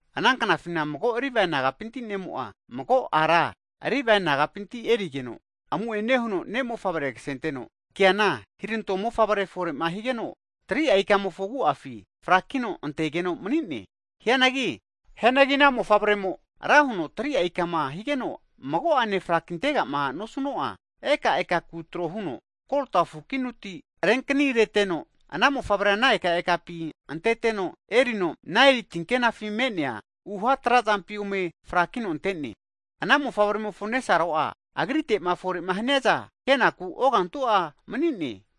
Ana knafina mago Livae nagapinti ne'mo'a, mago ara Livae nagapinti erigeno, amu'ene huno ne' mofavre ksenteno, keana hiranto mofavre fore'ma higeno, 3'a ikamofo agu'afi frakino antegeno mani'ne. Hianagi ana mofavre'mo ra huno 3'a ikama higeno mago'ane frakintega'ma nosuno'a, ekaeka ku tro huno, kolta fukinuti renkanireteno, ana mofavrea ana ekaekapi anteteno erino Naeli tinkenafi me'nea uha trazampi ome frakino ante'ne. Ana mofavremofo nesaro'a agrite'ma fore haniaza kenaku ogantu'a mani'ne.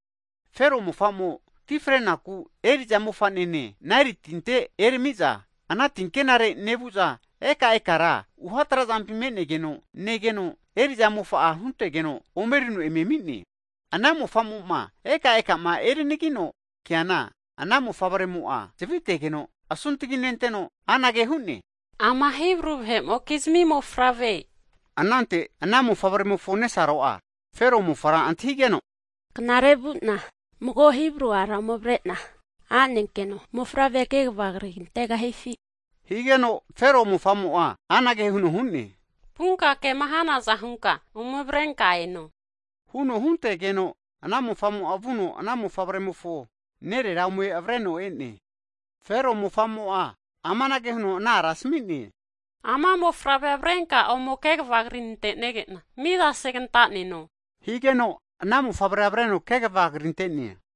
Fero mofa'mo ti frenaku, eri'za mofa'nene Naeli tinte erami'za, ana tinkenare nevu'za ekaekara uha trazampi me'negeno negeno, eri'za mofa'a huntegeno omerino eme ami'ne. Ana mofa'mo'ma ekaekama erinagino keana, ana mofavremo'a zavitegeno, asuntagi nenteno anage hu'ne, Ama Hibru vahe'mokizmi mofavre. Anante ana mofavremofo nesaro'a, Fero mofara antahigeno, Knare vu'na mago Hibru ara ome avre'na anenkeno mofavrea kegava krigantegahifi? Higeno Fero mofa'mo'a anage huno hu'ne, Vunka kema hanaza hunka ome avrenka eno huno huntegeno, ana mofa'mo'a vuno ana mofavremofo nerera ome avreno e'ne. Fero mofa'mo'a amanage huno ana ara asmi'ne, Ama mofavrea avrenka ome kegava krinante'nege'na, miza segantaneno, higeno ana mofavrea avreno kegava krinte'ne.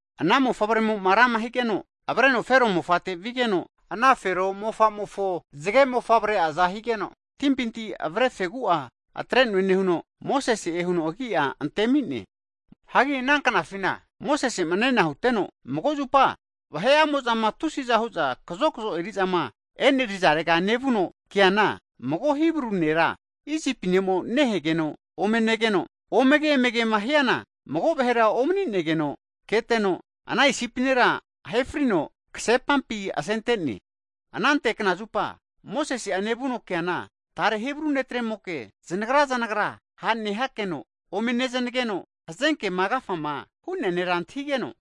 Ana mofavre'mo'ma rama higeno avreno Fero mofate vigeno, Fero mofa'mofo zage mofavre'aza higeno, timpinti avre fegu'a atre'noe nehuno Mosese'e huno agi'a antemi'ne. Hagi ana knafina Mosese'ma nena huteno, mago zupa vahe'amo'zama tusiza hu'za kazokzo eri'zama enerizarega nevuno keana, mago Hibru nera, Isipi ne'mo nehegeno ome negeno, omege emegema hiana mago vahera omani'negeno keteno, ana Isipi nera ahe frino ksepampi asente'ne. Anante knazupa Mosese'a nevuno keana tare Hibru ne'tremoke zanagra zanagra ha' nehakeno ome neznageno, hazenkema agafama hu'nea nera antahigeno,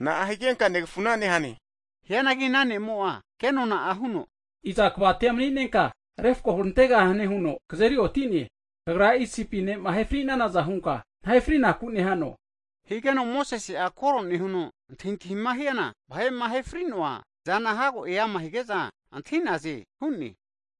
Na'a higenka negafuna nehane? Hianagi ana ne'mo'a ke'nona'a huno, Iza kvati'a maninenka refko hurantegahane huno kazeriotine? Kagra Isipi ne'ma ahe fri'nanaza hunka nahe frinaku nehano? Higeno Mosese'a koro nehuno antahintahima hiana, vahe'ma ahe fri'noa zana hago e'ama hige'za antahi'naze hu'ne.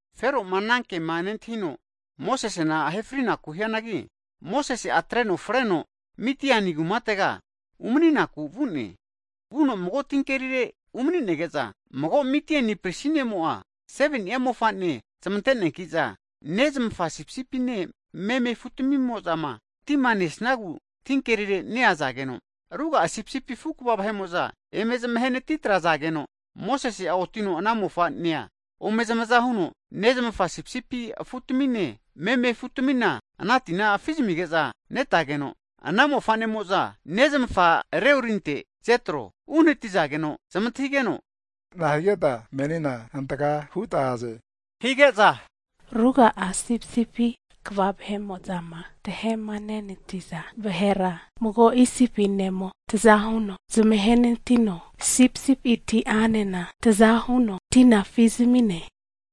Fero'ma ana kema nentahino, Mosesena ahe frinaku hianagi, Mosese'a atreno freno Midiani kumatega umaninaku vu'ne. Vuno mago tinkerire umani'nege'za, mago Midiani pristi ne'mo'a 7ni'a mofa'ne zmante'neanki'za, nezmafa sipisipine meme afu'tmimo'zama tima nesnagu tinkerire neazageno, ruga'a sipisipi afu kva vahe'mo'za eme zmahenati trazageno, Mosese'a otino ana mofa'nea ome zamaza huno nezmafa sipisipi afutamine, meme afutamina ana tina afi zamige'za netageno, ana mofa'nemo'za nezmafa Ruelinte (Jetro) uhanatizageno anage huno zmantahigene, nahigeta menina hantaka huta aze? hige'za, ruga'a sipisipi kva vahe'mo'zama tahemanenatiza vahera, mago Isipi ne'mo taza huno zmahenenatino, sipisipiti'anena taza huno tina afizmi'ne.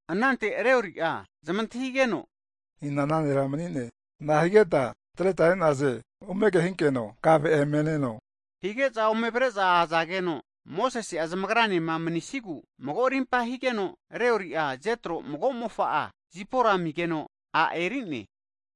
Anante Rueli'a (Jetro) zmantahigeno, ina ana nera mani'ne? Nahigeta atreta e'naze? Ome kehinkeno kave emeneno, hige'za ome avre'za azageno, Mosese'a zmagranema manisigu mago arimpa higeno Rueli'a (Jetro) mago mofa'a, Zipora amigeno a' eri'ne.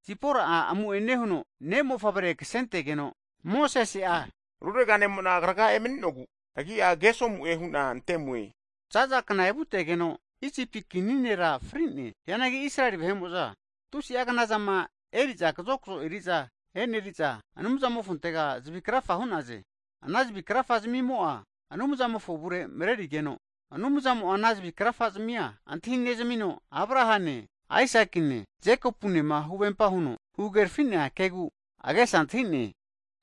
Zipora'a amu'ene huno ne' mofavre ksentegeno, Mosese'a rurega ne'mo'na kraga emani'nogu agi'a Gesomu'e hu'na ante'mue. Za'za kna evutegeno Isipi kini nera fri'ne. Hianagi Israeli vahe'mo'za tusi'a knazama eri'za kazokzo eri'za eneri'za, Anumzamofontega zavi krafa hu'naze. Ana zavi krafa zimimo'a Anumzamofo avure marerigeno, Anumzamo'a ana zavi krafazamia antahinezamino, Abrahane, Aisakine, Jekopunema huvempa huno huhagerafi'nea kegu agesa antahi'ne.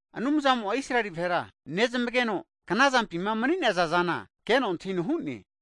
Anumzamo'a Israeli vahera nezmageno, knazampima mani'nazazana keno antahino hu'ne.